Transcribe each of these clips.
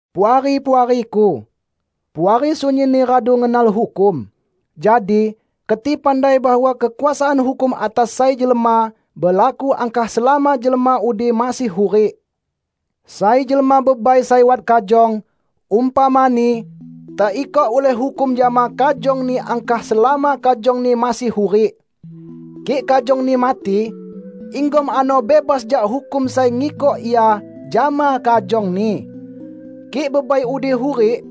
Puari-puariku! Puari sunyinni radu ngenal hukum. Jadi, keti pandai bahwa kekuasaan hukum atas sai jelma, belaku angkah selama jelma udi masih hurik. Sai jelma bebai sai wat kajong, umpamani, teikok ulih hukum jama kajongni angkah selama kajongni masih hurik. Kik kajongni mati, inggom ano bebas jak hukum sai ngikok ia jama kajongni. Kik bebai udi hurik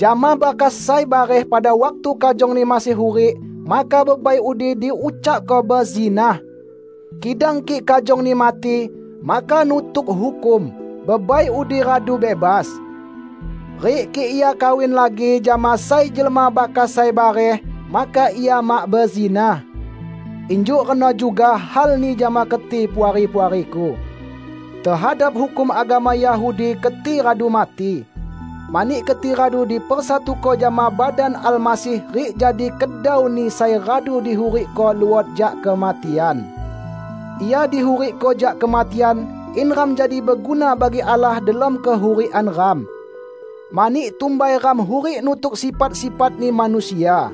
jama bakas sai bareh pada waktu kajongni masih hurik, maka bebai udi diucakko bezinah. Kidang kik kajongni mati, maka nutuk hukum, bebai udi radu bebas. Rik kik ia kawin lagi jama sai jelma bakas sai bareh, maka ia mak bezinah. Injuk reno juga halni jama keti, Puari-puariku. Tehadap hukum agama Yahudi keti radu mati, mani keti radu dipersatuko jama badan Almasih rik jadi kedau-Ni sai radu dihurikko luot jak kematian. Ia dihurikko jak kematian in ram jadi beguna bagi Allah delom kehurikan ram. Mani, tumbai ram hurik nutuk sifat-sifatni manusia.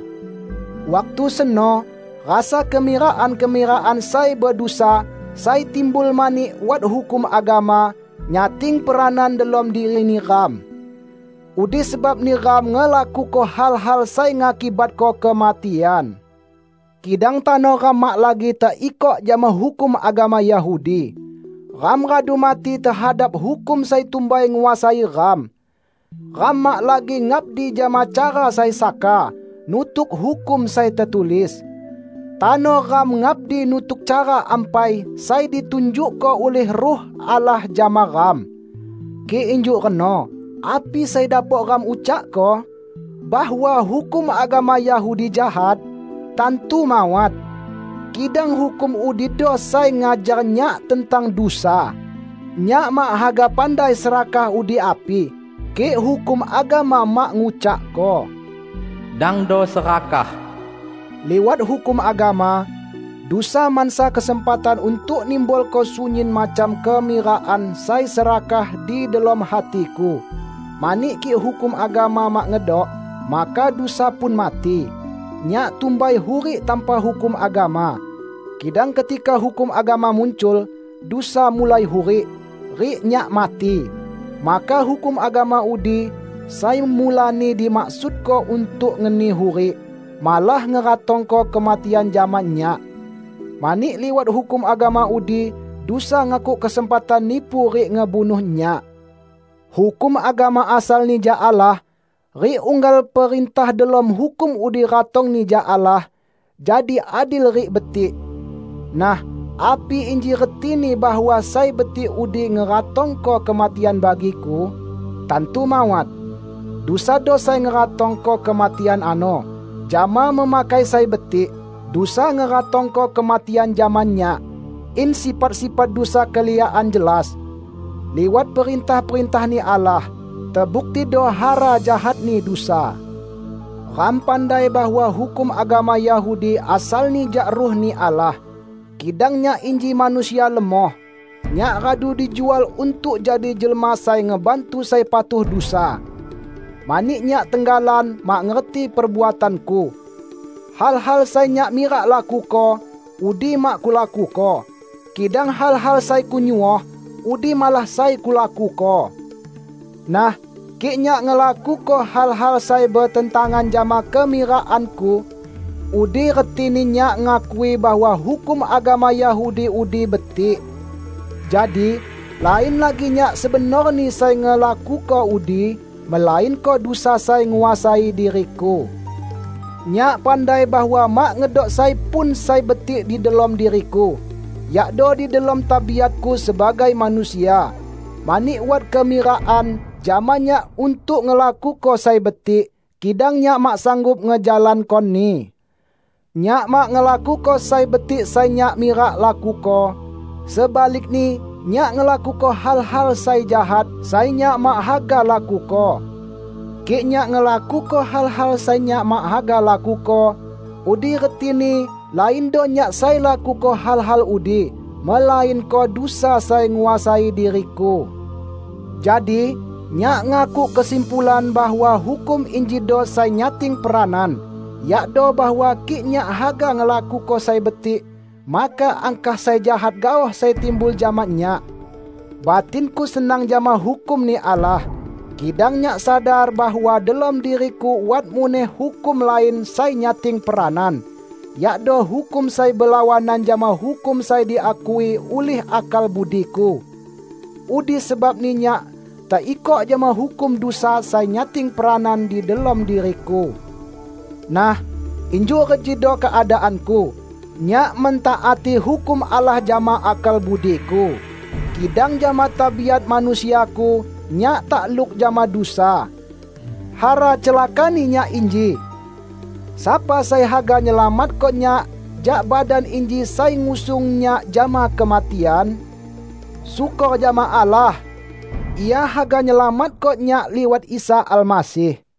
Waktu seno rasa kemirakan-kemirakan sai bedusa, sai timbul mani wat hukum agama, nyating peranan delom diri neram. Udi sebabni ram ngelakuko hal-hal sai ngakibatko kematian. Kidang tano ram mak lagi teikok jama hukum agama Yahudi. Ram radu mati tehadap hukum sai tumbai nguasai ram. Ram mak lagi ngabdi jama cara sai saka, nutuk hukum sai tetulis. Tano ram ngabdi nutuk cara ampai sai ditunjukko ulih Ruh Allah jama ram. Kik injuk reno, api sai dapok ram ucakko? Bahwa hukum agama Yahudi jahat? Tantu mawat! Kidang hukum udido sai ngajar nyak tentang dusa. Nyak mak haga pandai serakah udi api, kik hukum agama mak ngucakko, "Dangdo serakah." Liwat hukum agama, dusa mansa kesempatan untuk nimbulko sunyin macam kemirakan sai serakah di delom hatiku; mani kik hukum agama mak ngedok, maka dusa pun mati. Nyak tumbai hurik tanpa hukum agama. Kidang ketika hukum agama muncul, dusa mulai hurik rik nyak mati. Maka hukum agama udi, sai mulani dimaksudko untuk ngeni hurik, malah ngeratongko kematian jama nyak. Mani liwat hukum agama udi, dusa ngakuk kesempatan nipu rik ngebunuh nyak. Hukum agama asalni jak Allah, rik unggal perintah delom hukum udi ratongni jak Allah, jadi adil rik betik. Nah, api inji retini bahwa sai betik udi ngeratongko kematian bagiku? Tantu mawat! Dusado sai ngeratongko kematian ano. Jama memakai sai betik, dusa ngeratongko kematian jama nyak, in sifat-sifat dusa keliakan jelas. Liwat perintah-perintah-Ni Allah, tebuktido hara jahatni dusa. Ram pandai bahwa hukum agama Yahudi asalni jak Ruh-Ni Allah; kidang nyak inji manusia lemoh. Nyak radu dijual untuk jadi jelma sai ngebantu sai patuh dusa. Mani nyak tenggalan mak ngerti perbuatanku. Hal-hal sai nyak mirak lakuko, udi mak kulakuko; kidang hal-hal sai kunyuoh, udi malah sai kulakuko. Nah, kik nyak ngelakuko hal-hal sai betentangan jama kemirakanku, udi retini nyak ngakui bahwa hukum agama Yahudi udi betik. Jadi, lain lagi nyak sebenorni sai ngelakuko udi, melainko dusa sai nguasai diriku. Nyak pandai bahwa mak ngedok sai pun sai betik di delom diriku; yakdo di delom tabiatku sebagai manusia. Mani wat kemirakan jama nyak untuk ngelakuko sai betik, kidang nyak mak sanggup ngejalankoni. Nyak mak ngelakuko sai betik sai nyak mirak lakuko; sebalikni nyak ngelakuko hal-hal sai jahat, sai nyak mak haga lakuko. Kik nyak ngelakuko hal-hal sai nyak mak haga lakuko, udi retini laindo nyak sai lakuko hal-hal udi, melainko dusa sai nguasai diriku. Jadi, nyak ngakuk kesimpulan bahwa hukum injido sai nyating peranan: yakdo bahwa kik nyak haga ngelakuko sai betik, maka angkah sai jahat gaoh sai timbul jama nyak. Batinku senang jama hukum-Ni Allah, kidang nyak sadar bahwa delom diriku wat muneh hukum lain sai nyating peranan -- yakdo hukum sai belawanan jama hukum sai diakui ulih akal budiku. Udi sebabni nyak teikok jama hukum dusa sai nyating peranan di delom diriku. Nah, injuk rejido keadaanku: nyak mentaati hukum Allah jama akal budiku, kidang jama tabiat manusiaku, nyak takluk jama dusa. Hara celakani nyak inji! Sapa sai haga nyelamatko nyak jak badan inji sai ngusung nyak jama kematian? Syukor jama Allah! Ia haga nyelamatko nyak liwat Isa Almasih.